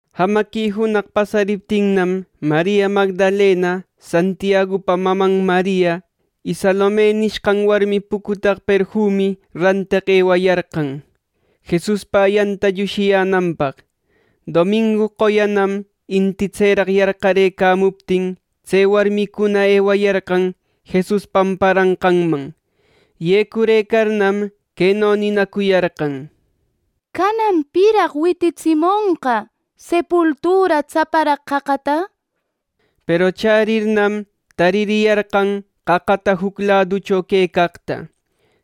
Jamaqui junaq pasariptinnam, Maria Magdalena, Santiagupa maman Maria, y Salome nishqan warmi pucutaq perfumi ranteq ewayarqan Jesuspa ayanta llushiyänanpaq. Domingu qoyanam inti tseraq yarqarëcamuptin tse warmicuna ewayarqan Jesus pamparanqanman. Yecurëcarnam, queno ninacuyarqan: —¿Canan piraq wititsimonqa sepultura tsaparaq qaqata? —nishpa. Peru chärirnam, taririyarqan qaqataqa juc laduchona quecaqta.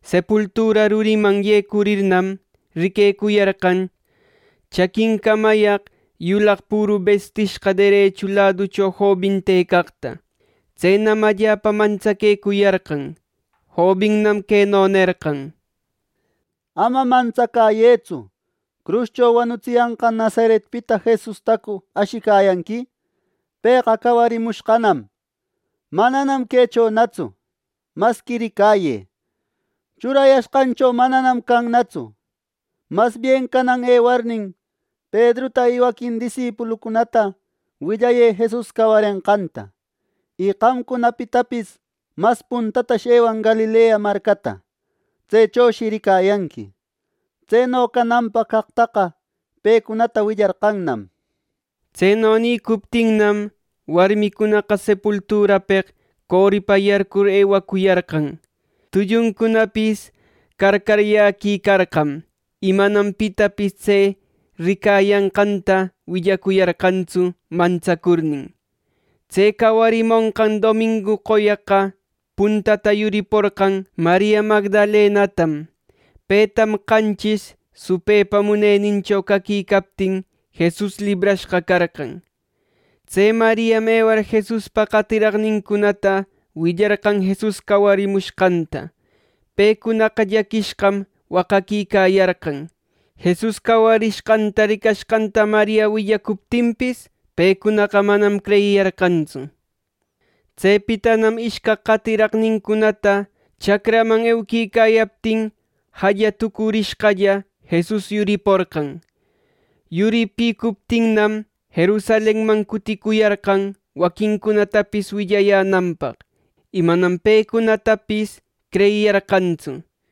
Sepultura ruriman yecurirnam, riquecuyarqan chaquincamayaq yulaq püru bistishqa derechu laducho jobin tëcaqta. Tsenam allapa mantsaquecuyarqan. Jobinnam queno nerqan: —Ama mantsacäyëtsu. ¿Cruscho wanutsiyanqan Nazaretpita Jesustacu ashiyanqui? Pëqa cawarimushqanam; mananam quechonatsu. Masqui ricayë, churayashqancho mananam cannatsu. Masbien canan ewarnin, Pedruta y waquin disipuluncunata willayë Jesus cawarenqanta; y qamcunapitapis mas puntatash ewan Galilea marcata. Tsechoshi ricayanqui. Tseno cananpaq caqtaqa pecunata willarqannam —nishpa. Tseno nïcuptinnam, warmicunaqa sepulturapeq coripa yarcur ewacuyarqan. Tulluncunapis carcaryaquicarqam, y manam pitapis tse ricayanqanta willacuyarqantsu mantsacurnin. ˻Tse cawarimonqan domingu qoyaqa puntata yuriporqan Maria Magdalenatam. Petam qanchis supëcunapa munenincho caquicaptin Jesus librashqa carqan. Tse Mariam ewar Jesuspa qatiraqnincunata willarqan Jesus cawarishqanta. Pecunaqa llaquishqam waqaquicayarqan. Jesus cawarishqanta ricashqanta Maria willacuptinpis, pecunaqa manam creyiyarqantsu. Tsepitanam ishcaq qatiraqnincunata chacraman euquicayaptin jalla tucurishqalla Jesus yuriporqan. Yuripicuptinnam, Jerusalenman cuticuyarqan waquincunatapis willayänanpaq, y manam pecunatapis creyiyarqantsu.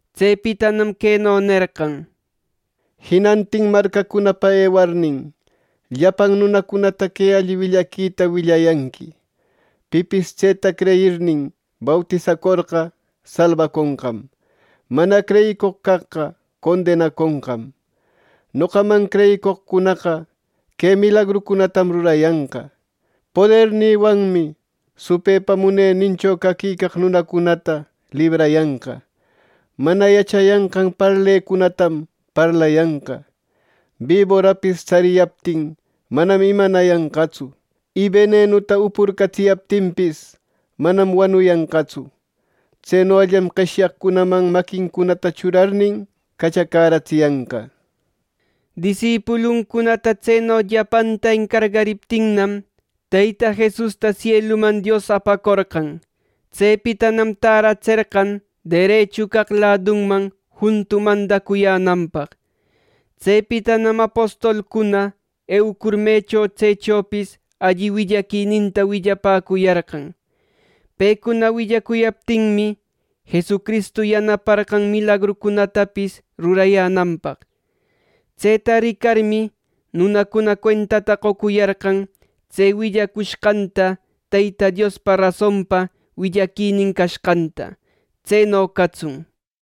Tsepitanam queno nerqan: —Jinantin marcacunapa ewarnin, llapan nunacunata que alli willaquinïta willayanqui. Pipis tseta creyirnin, bautisacorqa salbaconqam; mana creyicoq caqqa condenaconqam. Noqaman creyicoqcunaqa que milagrucunatam rurayanqa: Podernïwanmi supëpa munenincho caquicaq nunacunata librayanqa, mana yachayanqan parlecunatam parlayanqa, biborapis tsariyaptin manam imanayanqatsu, y benenuta upurcatsiyaptinpis, manam wanuyanqatsu. Tsenollam qeshyaqcunaman maquincunata churarnin cachacäratsiyanqa. Disipuluncunata tseno llapanta encargariptinnam, Teyta Jesusta sieluman Dios apacorqan. Tsepitanam tärätserqan derechu caq ladunman juntu mandacuyänapaq. Tsepitanam apostolcuna eucur mecho tsechopis alli willaquininta willapäcuyarqan. Pecuna willacuyaptinmi, Jesucristu yanaparqan milagrucunatapis rurayänanpaq. Tseta ricarmi, nunacuna cuentata qocuyarqan tse willacuyashqan Teyta Diospa rasonpa willaquinin cashqanta. Tseno catsun.˼